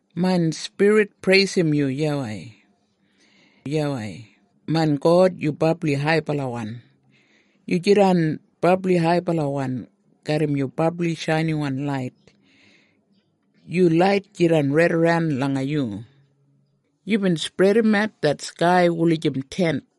Main spirit preisim yu YAWEI. YAWEI, main God, yu brabli haibalawan. Yu jidan brabli haibalawan garram yu brabli shainiwan lait. Yu lait jidan raidaran langa yu. Yubin spredimat det skai wulijim tent,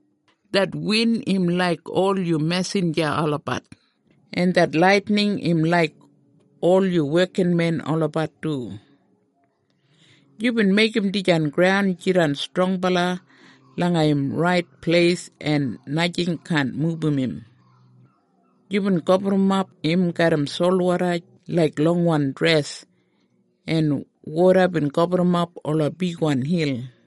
Det win im laik ol yu mesinja olabat, en det laitining im laik ol yu wekinmen olabat du. Yubin meigim dijan graun jidan strongbala langa im rait pleis en najing kaan mubum im. Yubin gaburrumap im garram solwoda laik longwan dres, en woda bin gaburrumap ola bigwan hil.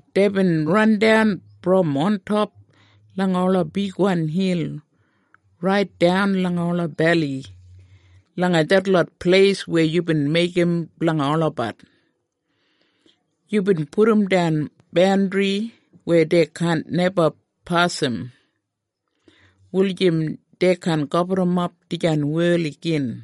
Deibin randan brom ontop langa ola bigwan hil raitdan langa ola beli, langa detlot pleis weya yubin meigim blanga olabat. Yubin pudumdan bandri weya dei kaan neba pasim, wulijim dei kaan gaburrumap dijan wel igin.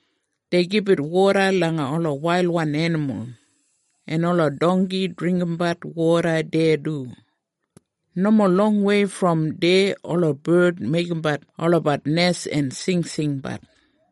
Dei gibit woda langa ola wailwan enimul, en ola dongki dringgimbat woda deya du. Nomo longwei brom deya ola bard meigimbat olabat nes en singsingbat.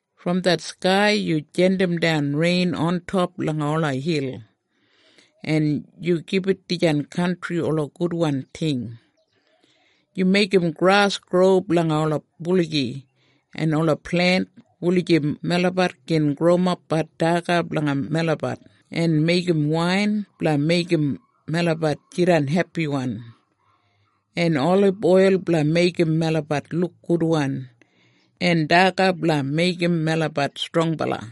Brom det skai yu jandimdan rein ontop langa ola hil, en yu gibit dijan kantri ola gudwan ting. Yu meigim gras gro blanga ola buligi, en ola plent, wulijim melabat gin growimapbat daga blanga melabat, en meigim wain blanga meigim melabat jidan hepiwan, en oliboil blanga meigim melabat luk gudwan, en daga blanga meigim melabat strongbala.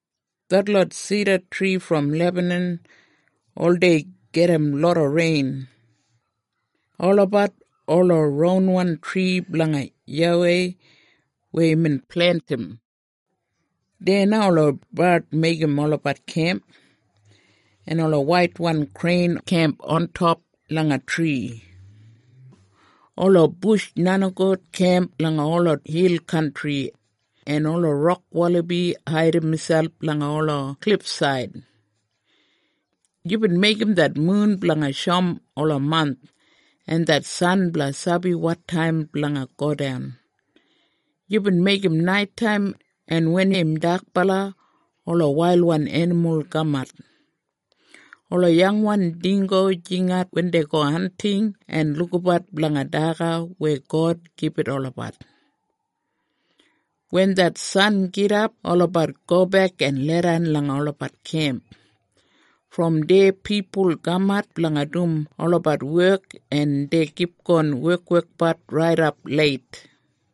Detlot sidatri brom Lebanan oldei gedim loda rein. Olabat ola ronwan tri blanga YAWEI weya imbin plentim. Deya na ola bard meigim olabat kemp, en ola waitwan krein kemp ontop langa tri. Ola bush nenigout kemp langa ola hil kantri, en ola rok walabi haidim miselp langa ola klifsaid. Yubin meigim det mun blanga shoum ola mant, en det san blanga sabi wotaim blanga godan. Yubin meigim naitaim, en wen im dakbala ola wailwan enimul kamat. Ola yangwan dinggo jingat wen dei go hanting en lukabat blanga daga weya God gibit olabat. Wen det san gidap olabat gobek en leidan langa olabat kemp. Brom deya pipul kamat blanga dum olabat wek en dei kipgon wekwekbat raidap leit.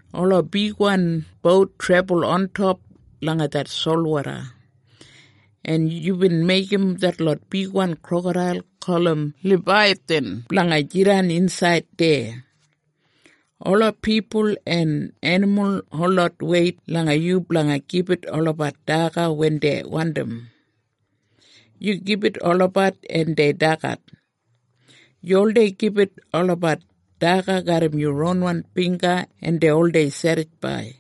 Ola bigwan bout trebul ontop langa det solwoda, en yubin meigim detlot bigwan krokadail gulum Labaiyathan blanga jidan insaid deya. Ola pipul en enimul holot weit langa yu blanga gibit olabat daga wen dei wandim. Yu gibit olabat en dei dagat. Yu oldei gibit olabat daga garram yu ronwan bingga en dei oldei sedisfaid.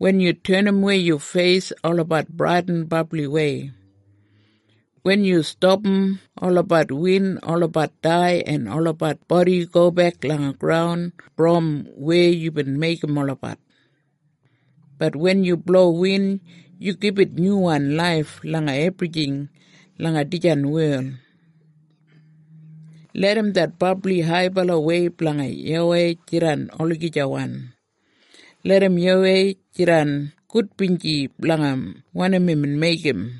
Wen yu tenimwei yu feis olabat bradin brabliwei. Wen yu stapam olabat win olabat dai en olabat bodi gobek langa graun brom weya yubin meigim olabat. Bat wen yu blo win, yu gibit nyuwan laif langa ebrijing langa dijan wel. Larram det brabli haibalawei blanga YAWEI jidan olagijawan. Larram YAWEI jidan gudbinji blanga wanim imbin meigim.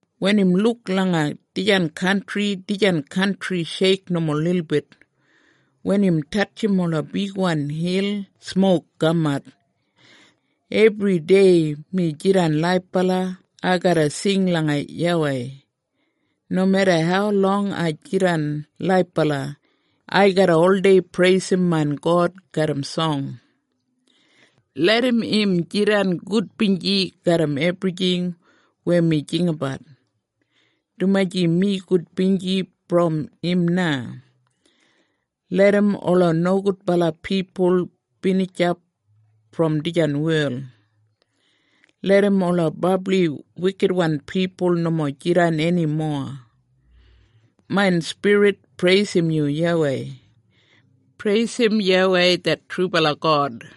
Wen im luk langa dijan kantri dijan kantri sheik nomo lilbit. Wen im tatjim ola bigwan hil smok kamat. Ebridei mi jidan laibala ai garra sing langa YAWEI. Nomeda haulong ai jidan laibala, ai garra oldei preisim main God garram song. Larram im jidan gudbinji garram ebrijing weya mi jinggabat, dumaji mi gudbinji brom im na. Larram ola nogudbala pipul binijap brom dijan wel. Larram ola brabli wikitwan pipul nomo jidan eni mowa. Main spirit, preisim yu YAWEI! Preisim YAWEI det trubala God!